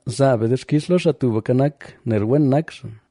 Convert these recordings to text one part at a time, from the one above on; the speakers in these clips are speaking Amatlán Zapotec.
¡Zaa be dixkix lo Xaa Tubka Nak, nel wen nak xaa,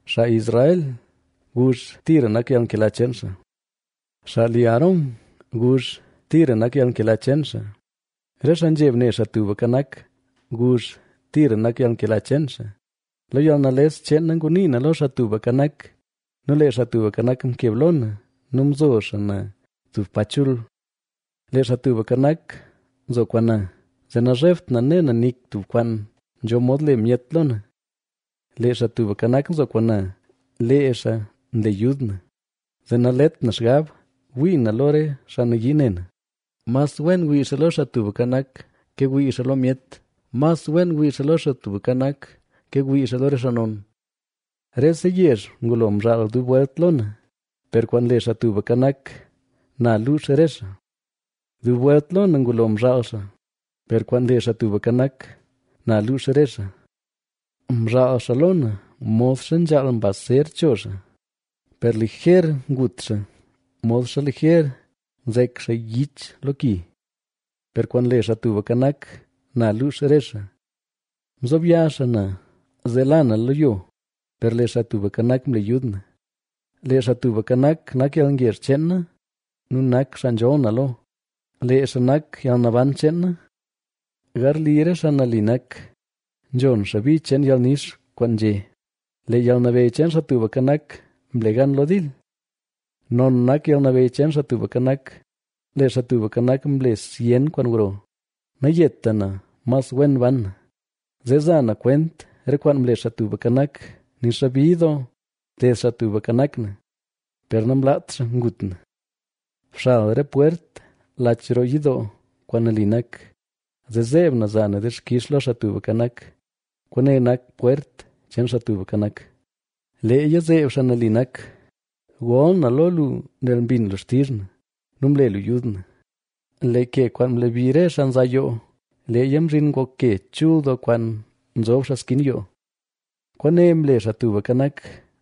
Xaa Israel guzh: “Tira nak yalnkela cheen xaa.” Xaa li Aarón guzh: “Tira nak yalnkela cheen xaa.” Re xaa nzheb ne Xaa Tubka Nak guzh: “Tira nak yalnkela cheen xaa.” Lo yalnales cheen na ngunii na lo Xaa Tubka Nak, nu lee Xaa Tubka Nak mkeb lo na nu mzo xaa na tub pa chul. Lee Xaa Tubka Nak nzo kwaan na, zee nazhebt na ne na nik tub kwaan nzho mod le myet lo na. Lee Xaa Tubka Nak, nzo kwaan na, lee xaa nle yud na, zee nalet na xgab wii na lo re xaa nayii ne na. Mas wen wii xaa lo Xaa Tubka Nak, ke wii xaa lo myet. Mas wen wii xaa lo Xaa Tubka Nak, ke wii xaa lo re xaa non. Rese yezh ngulo mzhaal dub welt lo na, per kwaan le Xaa Tubka Nak, na luux re xaa. Dub welt lo na ngulo mzhaal xaa, per kwaan le Xaa Tubka Nak, na luux re xaa. Mzhaal xaa lo na modxa nzhaal mbaz ser cho xaa, per liger ngut xaa modxa liger nzek xaa yich lo ki. Per kwaan le Xaa Tubka Nak, na luux re xaa. Mzob ya xaa na zee la na lo yo, per lee Xaa Tubka Nak mle yud na. Lee Xaa Tubka Nak, nak yalngezh cheen na nu nak xaa nzholl na lo, lee xaa nak yalnaban cheen na. Garli re xaa nali nak, nzhon xaa bi cheen yalnix kwaan nzhé: “Lee yalnabeyy cheen Xaa Tubka Nak mle gan lo dil. Non nak yalnabeyy cheen Xaa Tubka Nak, ¡Lee Xaa Tubka Nak, mle zyen kwaan gro!” Nayeta na, mas wen ban na, zee za na kwent re kwaan mle Xaa Tubka Nak. Nixa bid doo mted Xaa Tubka Nak na, per namlaat xaa ngut na. Bxal re pwert lach roo yidoo kwaan nali nak, zee zeeb na za na dixkix lo Xaa Tubka Nak. Kwaane nak pwert cheen Xaa Tubka Nak; leeya zeeb xaa nali nak. Gol na lo lu nel mbin lu xtizh na nu mle lu yud na. Lee ke kwaan mlebi re xaa nza yoo, leeya mzhin ngok ke chul doo kwaan nzob xaa skin yoo. Kwaane mle Xaa Tubka Nak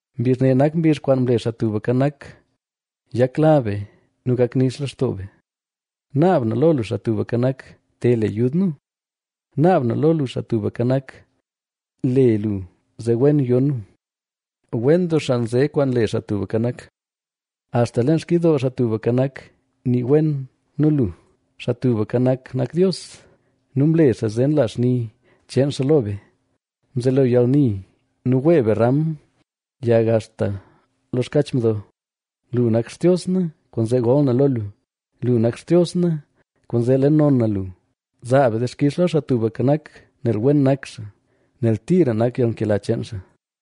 Mbizh ne nak mbizh kwaan mle Xaa Tubka Nak; yakla be nu gak nix lextoo be. Naab na lo lu Xaa Tubka Nak, te le yud nu; naab na lo lu Xaa Tubka Nak, le lu zee wen yo nu. Wen doo xaa nze kwaan le Xaa Tubka Nak,c axta leen xkidoo Xaa Tubka Nak nii wen nu xaa. Xaa Tubka Nak nak Dios nu mle xaa zee nla xni cheen xaa lo be; mzelo yalni nu wee be ram yag axta lo xkach mdo. Lu nak Xtios na kwaanzee gol na lo lu; lu nak Xtios na kwaanzee le non na lu. ¡Zaa be dixkix lo Xaa Tubka Nak nel wen nak xaa, nel tira nak yalnkela cheen xaa!